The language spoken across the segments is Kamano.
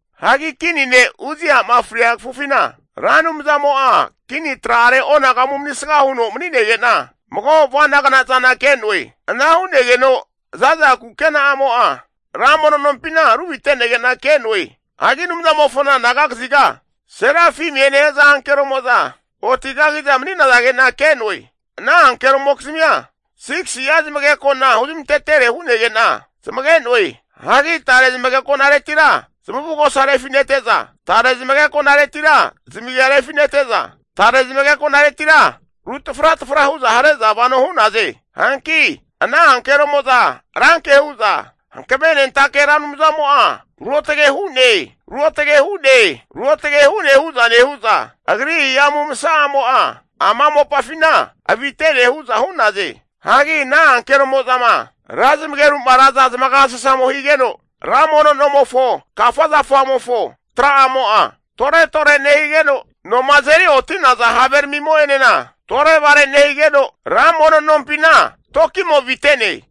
Hagi kini ne' Uzia'ma fria kafufina, Ra Anumzamo'a kini tra'are onagamu manisga huno mani'nege'na, mago avana'gna zana ke'noe. Ana hu'negeno zaza kukena'amo'a ra mono nompina ruvite'nege'na ke'no'e. Hagi Anumzamofona anaga kaziga, serafimie nehaza ankeromo'za oti kagiza mani'nazage'na ke'noe. Ana ankeromokizmia 6si'a zamageko'na huzmantetere hu'nege'na zamage'noe. Hagi tare zamageko'naretira zamavugosa rufi'nete'za, tare zamageko'naretira zamagia refinete'za, tare zamageko'naretira ru tafratafra hu'za hare'za vano hu'naze. Hanki ana ankeromo'za ranke hu'za Hankavenentake Ra Anumzamo'a ruotage hu'ne, ruotge hu'ne, ruotage hu'ne hu'za nehu'za, agri hihamu masa'amo'a ama mopafina avitene hu'za hu'naze. Hagi ana ankeromo'zama ra zamageru'ma raza zamagasasamo higeno, ra mono nomofo kafa zafamofo tra'amo'a tore tore nehigeno, noma azeri oti'naza have ramimo'enena tore'vare nehigeno, ra mono nompina toki'mo avite'ne.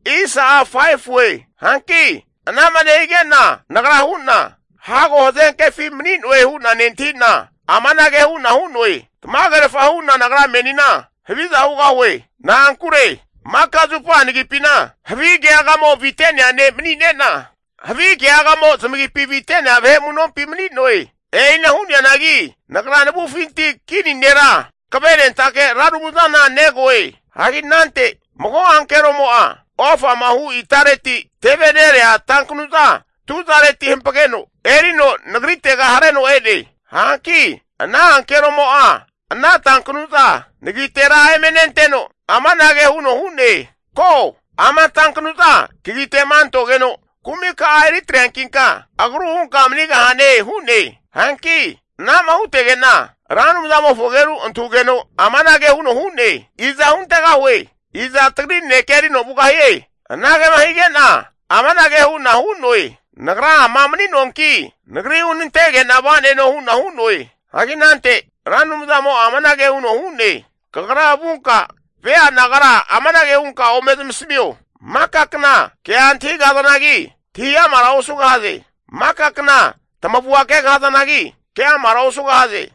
Hanki anama nehige'na nagra hu'na, hago hazenkefi mani'noe hu'na nentahina amanage hu'na hu'noe, Tamagerfa hu'na nagra menina haviza hugahue. Na'ankure maka zupa nagipina havi keagamo avite'nea ne' mani'ne'na, havi keagamo zamagipi avite'nea vahe amu'nompi mani'noe. E'ina hu'neanagi nagra navufinti Kini Nera Hankavenentake Ra Anumzana negoe. Hagi anante mago ankeromo'a ofama hu itareti, teve nerea tankanu'za tuzareti hampageno erino nagritega hareno e'ne. Hanki ana ankeromo'a ana tankanu'za nagitera eme nenteno, amanage huno hu'ne, Ko, ama tankanu'za kagite'ma antogeno kumika'a eri atreankinka agru hunka manigahane hu'ne. Hanki anama hutege'na Ra Anumzamofo ageru antahugeno amanage huno hu'ne, iza huntegahue? Iza Tagri nanekea erino vugahie? Anagema hige'na amanage hu'na hu'noe, Nagra ama mani'noanki, nagri hunantege'na va'neno hu'na hu'noe. Hagi anante Ra Anumzamo'a amanage huno hu'ne, kagra vunka vea nagara amanage hunka ome zamasamio, maka kna kea antahigahazanagi, antahi amara osugahaze. Maka kna tamavua kegahazanagi, ke'amara osugahaze.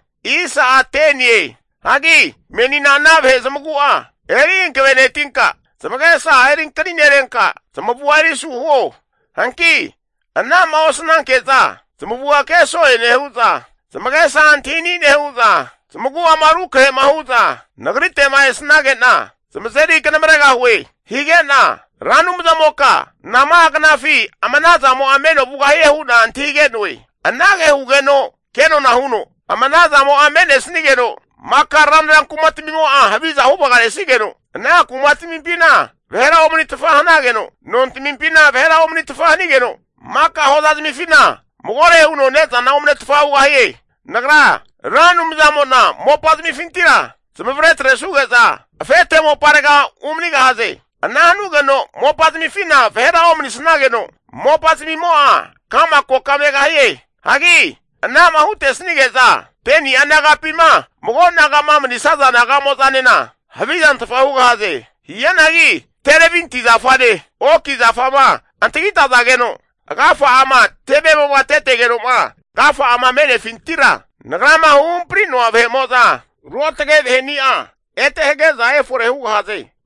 Hagi menina ana vahe zamagu'a eri hankavenetinka, zamagesa erinkaninerenka, zamavua eri asu huo. Hanki anama osnanke'za zamavua ke so'e nehu'za, zamagesa antahini nehu'za, zamagu'ama rukrahe'ma hu'za Nagrite'ma esnage'na zamazeri kanamaregahue. Higena Ra Anumzamoka nama'a knafi ama ana zamo'a meno vugahie hu'na antahige'noe. Anage hugeno kenona huno, Ama ana zamo'a me'nesnigeno, maka ranra kumatamimo'a haviza huvagaresnigeno, ana kumatamimpina vahera omanitfa hanageno, nontamimpina vahera omanitfa hanigeno, maka hoza zamifina magore huno ne'zana omnetfa hugahie. Nagra Ra Anumzamo'na mopazamifintira zamavare atresuge'za afete moparega umanigahaze. Ana hanugeno mopazamifina vahera omanisnageno, mopazamimo'a ka'ma koka megahie. Hagi ana'ma hutesnige'za 10ni'a nagapima mago naga'ma manisaza naga'mo'zanena havizantfa hugahaze. Hianagi terebinti zafane, oki zafama antagitazageno agafa'ama tevemo'ma tetegeno'ma agafa'a me'nefintima Nagrama huhampri'noa vahe'mo'za ruotage vahe'nia ete hage'za efore hugahaze.